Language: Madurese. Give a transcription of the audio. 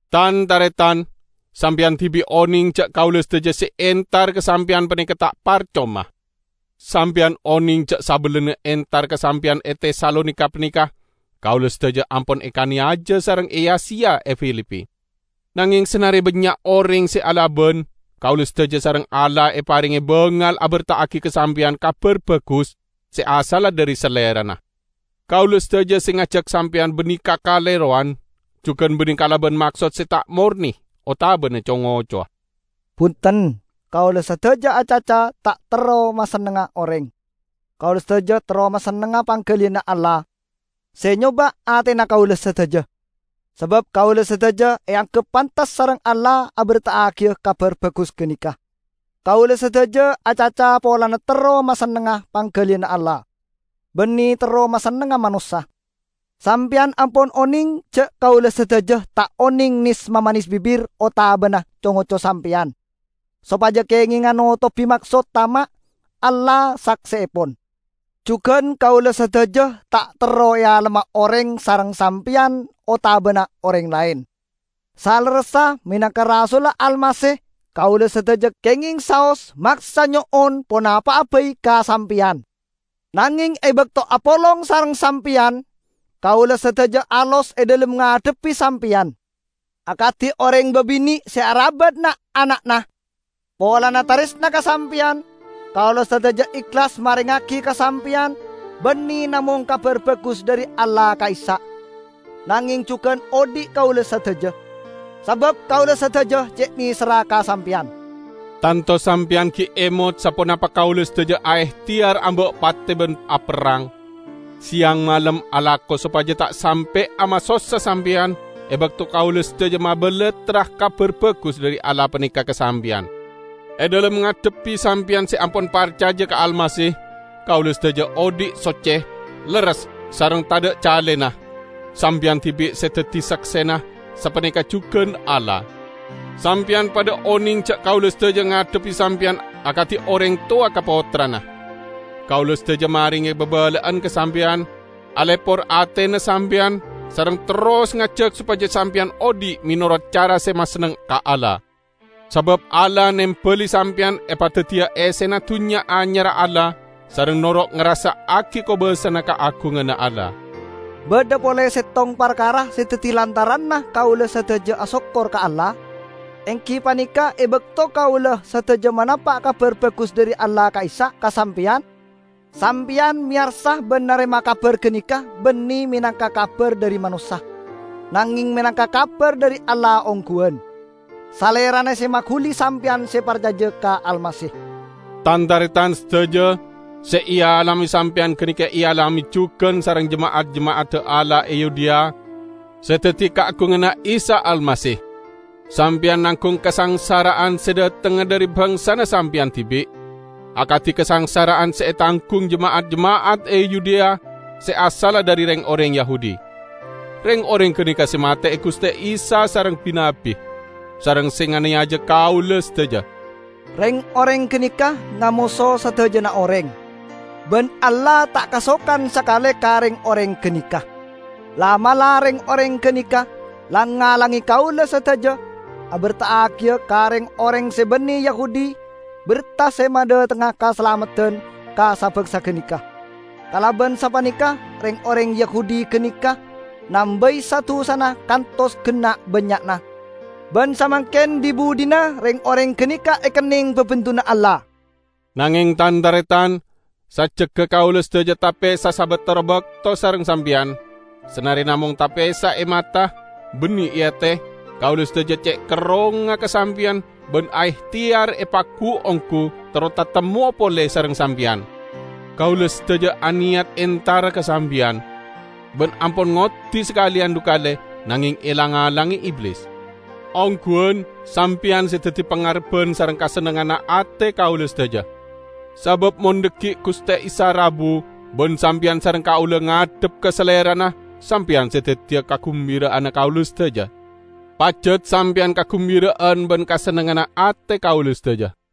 Tan-taretan! Sampeyan dibi' oneng ja' kaula sadaja se entar ka sampeyan paneka ta' parcoma. Sampeyan oneng ja' sabellunna entar ka sampeyan e Tesalonika paneka, kaula sadaja ampon ekaneyaja sareng eya-seya e Filipi. Nangeng sanare bannya' oreng se alaban, kaula sadaja sareng Allah eparenge bangal aberta'agi ka sampeyan Kabar Bagus se asalla dhari Salerana. Kaula sadaja se ngajak sampeyan banne kakalerowan; jugan banne kalaban maksod se ta' morne otabana co-ngocowa. Bunten, kaula sadaja acaca ta' terro masennengnga oreng; kaula sadaja terro masennengnga panggaliyanna Allah, se nyoba' atena kaula sadaja. Sabab kaula sadaja eanggep pantes sareng Allah aberta'agiya Kabar Bagus ganeka. Kaula sadaja acaca polana terro masennengnga panggaliyanna Allah, banne terro masennengnga manossa. Sampeyan ampon oneng ja' kaula sadaja ta' oneng nes-mamanes bibir otabana co-ngoco sampeyan sopaja kengenga notobi maksod tama'. Allah sakseepon! Jugan kaula sadaja ta' terro ealemma oreng -- sareng sampeyan otabana oreng laen. Salerressa, menangka rasulla Almasih kaula sadaja kengeng saos maksa nyo'on ponapa'a bai ka sampeyan. Nangeng e bakto apolong sareng sampeyan, kaula sadaja alos e dhalem ngadhebbi sampeyan, akadi oreng babine' se arabat na'-ana'na. Polana taresna ka sampeyan, kaula sadaja ehlas marengngagi ka sampeyan banne namong Kabar Bagus dhari Allah ka'issa', nangeng jugan odhi' kaula sadaja. Sabab kaula sadaja ce' neserra ka sampeyan! Tanto sampeyan gi' emot saponapa kaula sadaja aehteyar amba' pate ban aperrang. Seyang malem alako sopaja ta' sampe'a masossa sampeyan e bakto kaula sadaja mabalattra Kabar Bagus dhari Allah paneka ka sampeyan. E dhalem ngadhebbi sampeyan se ampon parcaja ka Almasih, kaula sadaja odhi' socce, lerres sareng tadha' calena. Sampeyan dibi' se daddi saksena, sapaneka jugan Allah. Sampeyan padha oneng ja' kaula sadaja ngadhebbi sampeyan akadi oreng towa ka pottrana. Kaula sadaja marenge babala'an ka sampeyan, alepor atena sampeyan, sareng terros ngajak sopaja sampeyan odhi' menorot cara se masenneng ka Allah. Sabab Allah nembali sampeyan epadaddiya essena Dunnya Anyarra Allah sareng noro' ngarassa'agi kobassana kaagunganna Allah. Badha pole settong parkara se daddi lantaranna kaula sadaja asokkor ka Allah, enggi paneka e bakto kaula sadaja manapa' Kabar Bagus dhari Allah ka'issa' ka sampeyan, sampeyan meyarsa ban narema kabar ganeka banne menangka kabar dhari manossa, nangeng menangka kabar dhari Allah ongguwan. Salerana se maguli sampeyan se parcaja ka Almasih. Tan-taretan sadaja, se ealame sampeyan ganeka ealame jugan sareng jema'at-jema'adda Allah e Yudea se daddi kaagunganna Isa Almasih. Sampeyan nanggung kasangsara'an se dhatengnga dhari bangsana sampeyan dibi', akadi kasangsara'an se etanggung jema'at-jema'at e Yudea se asalla dhari reng-oreng Yahudi. Reng-oreng ganeka se mate'e Guste Isa sareng bi-nabbi, sareng se nganeyaja kaula sadaja. Reng-oreng ganeka ngamoso sadajana oreng, ban Allah ta' kasokan sakale ka reng-oreng ganeka. La'-mala' reng-oreng ganeka lang-ngalange kaula sadaja aberta'agiya ka reng-oreng se banne Yahudi berta se madhatengnga kasalameddan ka sa-bangsa ganeka. Kalaban sapaneka reng-oreng Yahudi ganeka nambai sa-dusana kantos genna' bannya'na. Ban samangken dhi-budhina reng-oreng ganeka ekenneng babendunna Allah! Nangeng tan-taretan, sajjegga kaula sadaja tapesa sabatara bakto sareng sampeyan -- sanare namong tapesa e mata, banne e ate, kaula sadaja ce' kerrongnga ka sampeyan ban aehteyar epagu-onggu terro tatemmowa pole sareng sampeyan! Kaula sadaja aneyat entara ka sampeyan; ban ampon ngoddi sakaleyan dhu kale, nangeng elang-alange Iblis. Ongguwan, sampeyan se daddi pangarebban sareng kasennengnganna ate kaula sadaja. Sabab mon dhaggi' Guste Isa rabu, ban sampeyan sareng kaula ngadhep ka Salerana, sampeyan se daddiya kagumbira'anna kaula sadaja! Pajat sampeyan kagumbira'an ban kasennengnganna ate kaula sadaja!